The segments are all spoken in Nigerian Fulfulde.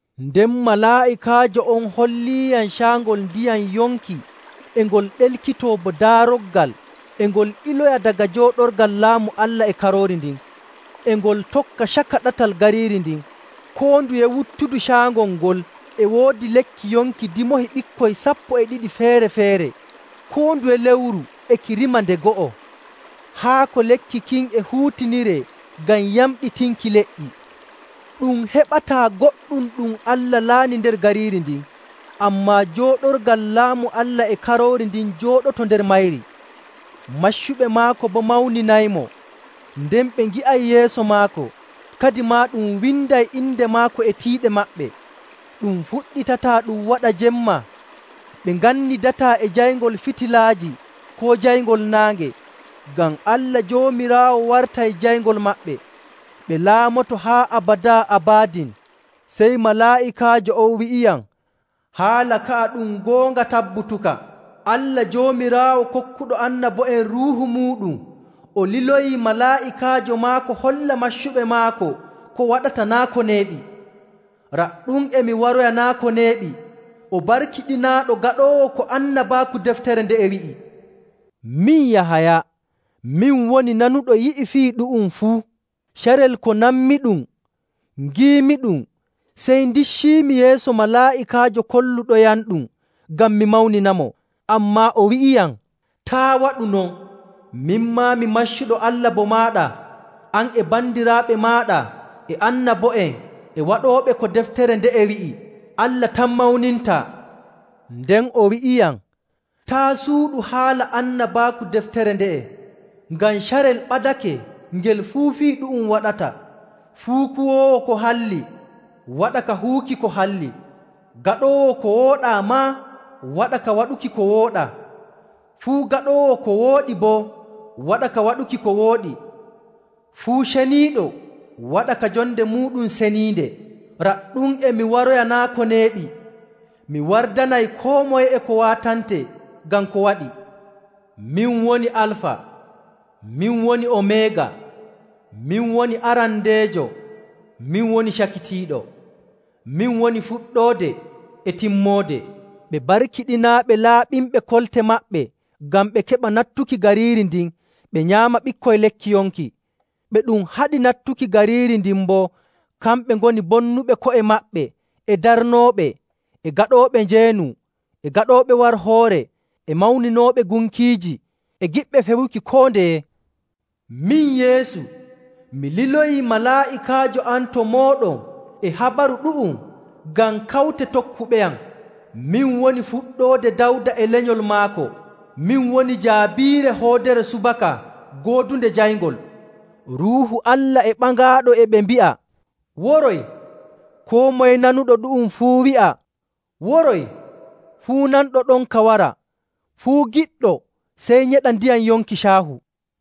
Nden malaa'ikaajo on holliyam caangol ndiyam yonki e ngol ɗelkitoo bo daaroggal e ngol iloya daga jooɗorgal laamu Allah e Karoori ndin, e ngol tokka caka ɗatal gariiri ndin. Koo nduye wuttudu caangol ngol e woodi lekki yonki dimoohi ɓikkoy sappo e ɗiɗi feere‑feere, koo nduye lewru e ki rima nde go'o. Haako lekki kin e huutiniree ngam yamɗitinki leƴƴi. Ɗum heɓataa goɗɗum ɗum Allah laani nder gariiri ndin, ammaa jooɗorgal laamu Allah e Karoori ndin jooɗoto nder mayri. Maccuɓe maako boo mawninaymo. Nden ɓe ngi'ay yeeso maako, kadimaa ɗum winday inde maako e tiiɗe maɓɓe. Ɗum fuɗɗitataa ɗum waɗa jemma, ɓe ngannidataa e jayngol fitilaaji koo jayngol naange, ngam Allah Joomiraawo wartay jayngol maɓɓe. Ɓe laamoto haa abadaa abadin. Sey malaa'ikaajo on wi'iyam, “Haala ka'a ɗum goonga tabbutuka. Allah Joomiraawo kokkuɗo annabo'en Ruuhu muuɗum o liloyi malaa'ikaajo maako holla maccuɓe maako ko waɗata naa' ko neeɓi.” “Raɗɗum e mi waroya naa' ko neeɓi! O barkiɗinaaɗo gaɗoowo ko annabaaku deftere nde'e wi'i.” Min Yahaya, min woni nanuɗo yi'i fii ɗu'um fuu. Carel ko nanmiɗum ngiimiɗum, sey ndicciimi yeeso malaa'ikaajo kolluɗoyamɗum ngam mi mawninamo. Ammaa o wi'iyam, “Taa' waɗu non! Min maa, mi maccuɗo Allah bo maaɗa, an e bandiraaɓe maaɗa, e annabo'en, e waɗooɓe ko deftere nde'e wi'i. Allah tan mawnintaa!” Nden o wi'iyam, “Taa' suuɗu haala annabaaku deftere nde'e. Ngam carel ɓadake ngel fuu fii ɗu'um waɗata. Fuu kuwoowo ko halli waɗa ka huwuki ko halli, gaɗoowo ko wooɗaa maa, waɗa ka waɗuki ko wooɗaa. Fuu gaɗoowo ko wooɗi boo, waɗa ka waɗuki ko wooɗi, fuu ceniiɗo waɗa ka jonde muuɗum seniinde.” “Raɗɗum e mi waroya naa' ko neeɓi! Mi wardanay koo moye e ko waatantee ngam ko waɗi. Min woni Alfa, min woni Omeega, min woni Arandeejo, min woni Cakitiiɗo, min woni Fuɗɗoode e Timmoode.” Ɓe barkiɗinaaɓe laɓɓinɓe kolte maɓɓe ngam ɓe keɓa nattuki gariiri ndin ɓe nyaama ɓikkoy lekki yonki. Ɓe ɗum haɗi nattuki gariiri ndin boo, kamɓe ngoni bonnuɓe ko'e maɓɓe, e darnooɓe, e gaɗooɓe njeenu, e gaɗooɓe warhoore, e mawninooɓe gunkiiji, e giɗɓe fewuki koo ndeye. “Min Yeesu, mi liloyii malaa'ikaajo am to mooɗon e habaru ɗu'um ngam kawte tokkuɓeyam. Min woni fuɗɗoode Dawda e lenyol maako, min woni Jaabiire, hoodere subaka goodunde jayngol.” Ruuhu Allah e Ɓaŋaaɗo e ɓe mbi'a, “Woroy!” Koo moye nanuɗo ɗu'um fuu wi'a, “Woroy!” Fuu nanɗo ɗonka wara, fuu giɗɗo sey nyeɗa ndiyam yonki caahu.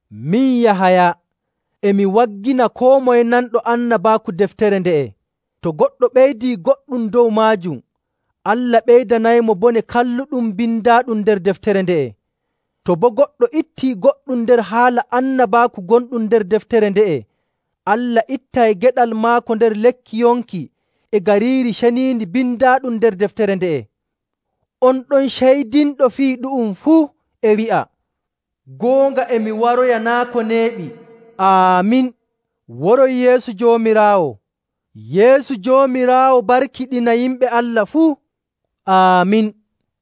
Min Yahaya, e mi waggina koo moye nanɗo annabaaku deftere nde'e. To goɗɗo ɓeydii goɗɗum dow maajum, Allah ɓeydanaymo bone kalluɗum bindaaɗum nder deftere nde'e. To boo goɗɗo ittii goɗɗum nder haala annabaaku gonɗum nder deftere nde'e, Allah ittay geɗal maako nder lekki yonki e Gariiri Ceniindi bindaaɗum nder deftere nde'e. On ɗon ceydinɗo fii ɗu'um fuu e wi'a, “Goonga e mi waroya naa' ko neeɓi.” Aamin. Woroy Yeesu Joomiraawo! Yeesu Joomiraawo barkiɗina yimɓe Allah fuu. Aamin!